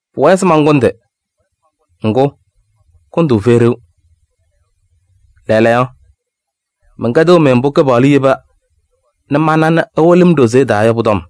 Pʋwɛɛ se mankʋndɩ. Ŋgʋ, kʋndʋʋ fɛyɩ ɖeu. Lɛɛlɛɛyɔ, mɛnkɛdɩɣ-mɩ mbʋ Kɩpaɣlʋ yeba nɛ mana nɛ mbʋ ɛwɩlɩ-m ɖozee taa yɔ pʋ-tɔm.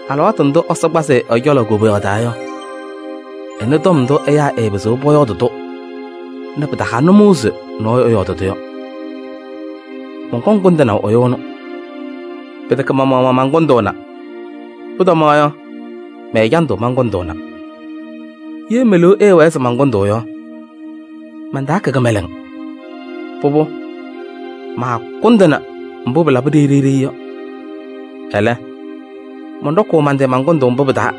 alɩwaatʋ ndʋ Ɛsɔ kpazɩ-ɩ ɛ-cɔlɔ koboyaɣ taa yɔ, ɛnɩ tɔm ndʋ ɛyaa ɛɛpɩzɩɣ pɔyɔɔdɩ-tʋ nɛ pɩtaha nʋmɔʋ se ɛyʋ ɛyɔɔdɩ-tʋ yɔ. Mɔnkɔŋ kʋndɩnaʋ ɛyʋ ɛnʋ. Pɩtɛkɛ ma-maɣmaɣ mankʋndʋʋna. Pʋtɔmaɣ yɔ, mɛ-ɛjandʋ mankʋndʋʋna. Ye me-liu ɛɛwɛɛ se mankʋndʋʋ yɔ, mantaakɛ kɩmɛlɛŋ. Pʋbʋ maakʋndɩnɩ mbʋ pɩlabɩ ɖeyi ɖeyi yɔ. Ɛlɛ, mɔnɖɔkʋʋ man-tɩ man-kʋndʋʋ mbʋ pɩ-taa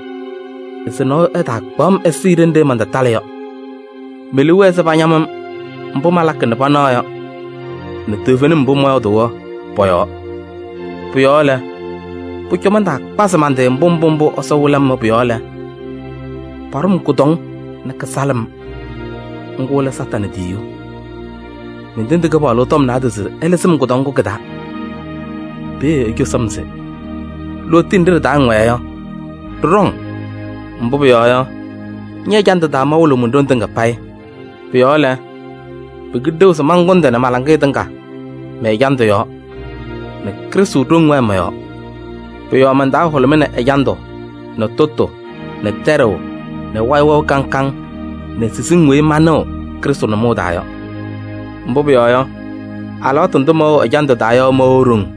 se nɔɔyʋ ɛtaakpaɣ-m ɛsɩɩ ɖenɖe mantatalɩ yɔ. Me-liu wɛɛ se pañam-m mbʋ malakɩ nɛ panaɣ yɔ nɛ toovenim mbʋ mɔyɔɔdʋʋ yɔ pɔ-yɔɔ. Pʋ-yɔɔ lɛ, pʋcɔ mantaakpazɩ man-tɩ mbʋ mbʋ Ɛsɔ wɩlɩ-m yɔ pʋ-yɔɔ lɛ, paɖʋ-m kʋdɔŋ nɛ kɩsalɩɣ-m, ŋgʋ lɛ Satanɩ tiyiyu. Mentendi Kɩpaɣlʋ tɔm naadozo se ɛlɩzɩ-m kʋdɔŋ ŋgʋ kɩ-taa. Peeye ecosi-m se: lootiye nɖɩ ɖɩ-taa ŋwɛɛ yɔ, ɖɩɖɔ-ŋ. Mbʋ pʋyɔɔ yɔ, ñɛ-ɛjandʋ taa mawɩlɩɣ mon-ɖoŋ tɩŋa payɩ. Pʋ-yɔɔ lɛ, pɩkɩlɩ ɖeu se mankʋndɩ nɛ ma-laŋɩyɛ tɩŋa mɛ-ɛjandʋ yɔɔ nɛ Krɩstʋ ɖoŋ wɛɛ mɔ-yɔɔ. Pʋ-yɔɔ man-taa hʋlʋmɩnɩ ɛjandʋ nɛ tʋtʋ nɛ tɛɖʋʋ nɛ wayɩ wɛʋ kaŋ kaŋ nɛ siziŋ weyi manɩɣ Krɩstʋ nʋmɔʋ taa yɔ. Mbʋ pʋyɔɔ yɔ, alɩwaatʋ ndʋ mɛwɛɣ ɛjandʋ taa yɔ mɛwɛɣ ɖoŋ.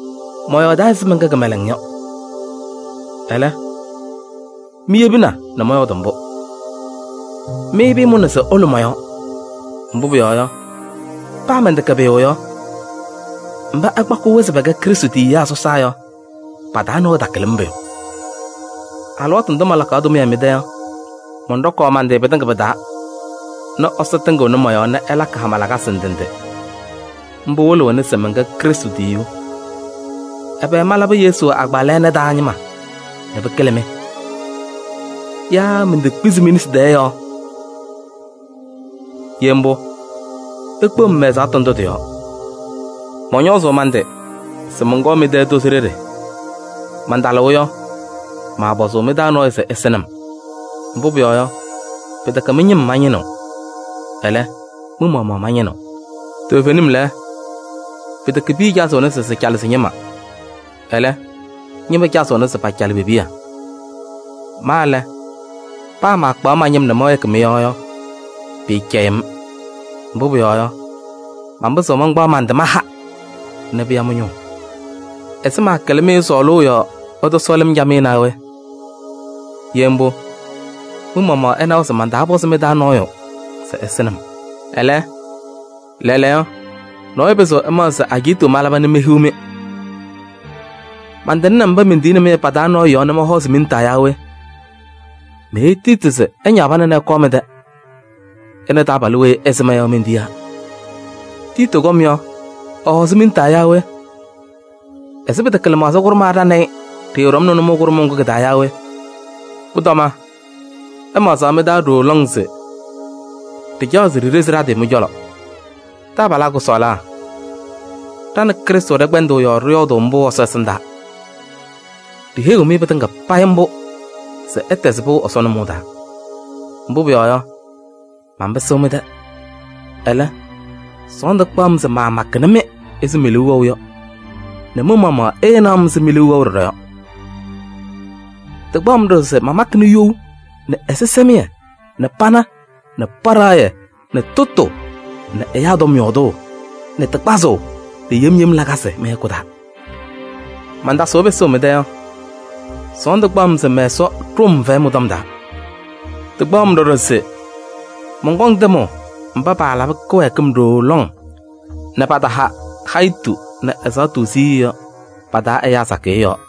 Mɔyɔɔdaa ɛzɩ mɛnkɛ kɩmɛlɛŋ yɔ: ɛlɛ, miyebina nɛ mɔyɔɔdɩ mbʋ. Mɩ pɩɩmʋnaa se ɩlʋ mɔ-yɔɔ. Mbʋ pʋyɔɔ yɔ, paa mɛntɛkɛ pʋyʋ yɔ, mba ɩkpakaɣ-wɛ se pɛkɛ Krɩstʋ tiyiyaa sɔsaa yɔ, pa-taa nɔɔyʋ takɩlɩ-m pʋyʋ. Alɩwaatʋ ndʋ malakaɣ tʋmɩyɛ mɩ-tɛ yɔ, mɔnɖɔkaɣ man-tɩ pɩtɩŋa pɩ-taa nɛ Ɛsɔ tɩŋɩɣnɩ mɔ-yɔɔ nɛ ɛlakɩ ɛ-hama lakasɩ ndɩ ndɩ. Mbʋ wɩlɩɣna se mɛnkɛ Krɩstʋ tiyiyu. Ɛbɛ malabɩ Yesu agbaa lɛɛna taa ñɩma nɛ pɩkɩlɩ-mɩ? Yaa mentekpizi mi-nesi taa yɔɔ? Ye mbʋ, ikpeɣ-m mɛ-ɛzaɣtʋ ndʋ tɩ-yɔɔ. Mɔñɔɔzɩ man-tɩ se mɔnkɔɔ mɩ-tɛ tozo ɖeɖe. Mantalɩɣ yɔ, maapɔzʋʋ mɩ-taa nɔɔyʋ se ɛsɩnɩ-m. Mbʋ pʋyɔɔ yɔ, pɩtɛkɛ mɩ-ñɩm mañɩnɩɣ, ɛlɛ, mɩ-maɣmaɣ mañɩnɩɣ. Toovenim lɛ, pɩtɛkɛ piya cazɩɣna se sɩcalɩ sɩ-ñɩma, ɛlɛ, ñɩma cazɩɣna se pacalɩ pe-piya. Ma lɛ, paa mankpaɣ ma-ñɩm nɛ mɛwɛɛkɩ mɩ-yɔɔ yɔ, pɩɩcɛyɩɣ-m. Mbʋ pʋyɔɔ yɔ, manpɩzɩɣ mankpaɣ man-tɩ maha nɛ pɩya mɩ-ñʋʋ. Ɛzɩ mankɩlɩ-mɩ sɔɔlʋʋ yɔɔ ɩtɔsɔɔlɩ-m camɩyɛ naa we? Ye mbʋ, mɩ-maɣmaɣ ɩnawa se mantaapɔzɩ mɩ-taa nɔɔyʋ se ɛsɩnɩ-m. Ɛlɛ, lɛɛlɛɛyɔ, nɔɔyʋ pɩzɩɣ ɛmaɣzɩ se ajiitu malaba nɛ mehiɣ-mɩ. Mantɩŋnɩ mba mentiyini-mɩ yɔ pa-taa nɔɔyʋ yɔɔ nɛ mɔhɔɔzɩ mi-nesi taa yaa we? Meheyi Tiiti se ɛñaɣ pana nɛ ɛkɔɔ mɩ-tɛ. Ɛ nɛ taabalʋ weyi ɩsɩma yɔ mentiyaa. Tiiti kɔm yɔ, ɛhɔɔzɩ mi-nesi taa yaa we? Ɛzɩ pɩtɛkɛ lɩmaɣza kʋɖʋma ɖa nɛ ɩ ɖɩɖɔmnɩ nʋmɔʋ kʋɖʋmʋʋ taa yaa we? Pʋtɔma ɩmaɣzaɣ mɩ-taa ɖooo lɔŋ se ɖɩcaɣ se ɖiɖezi ɖa-tɩ mɩ-cɔlɔ. Taabalaa kʋsɔɔlaa, ɖa nɛ Krɩstʋ ɖɩkpɛndaa yɔɔ ɖɩyɔɔdʋʋ mbʋ Ɛsɔ ɛsɩndaa. Ɖiheyiɣ-mɩ pɩtɩŋa payɩ mbʋ se ɩtɛzɩ pɩʋ Ɛsɔ nʋmɔʋ taa. Mbʋ pʋyɔɔ yɔ, manpɩsɩɣ mɩ-tɛ. Ɛlɛ, sɔɔndʋ kpaɣ-m se maamakɩnɩ-mɩ ɛzɩ me-liu wɛʋ yɔ nɛ mɩ-maɣmaɣ ɩɩnaɣ-m ɛzɩ mi-liu wɛʋ ɖɔɖɔ yɔ. Tɩkpaɣ-m ɖɔɖɔ se mamakɩnɩ you nɛ ɛzɩsɛmɩyɛ nɛ pana nɛ paɖaɣyɛ nɛ tʋtʋ nɛ ɛyaa tɔm yɔɔdʋʋ nɛ tɩ kpazʋʋ nɛ yem yem lakasɩ mɩ-hɛkʋ taa. Mantasʋʋ pɩsʋʋ mɩ-tɛ yɔ, sɔɔndʋ kpaɣ-m se mɛ-Ɛsɔ ɖʋʋ-m fɛyɛ mɩ-tɔm taa. Tɩkpaɣ-m ɖɔɖɔ se mɔnkɔŋ tɩmʋʋ mba paalabɩ kɩwɛɛkɩm ɖooo lɔŋ nɛ pataha hayitu nɛ ɛzaɣtʋ siɣye yɔ, pa-taa ɛyaa sakɩyɛ yɔɔ.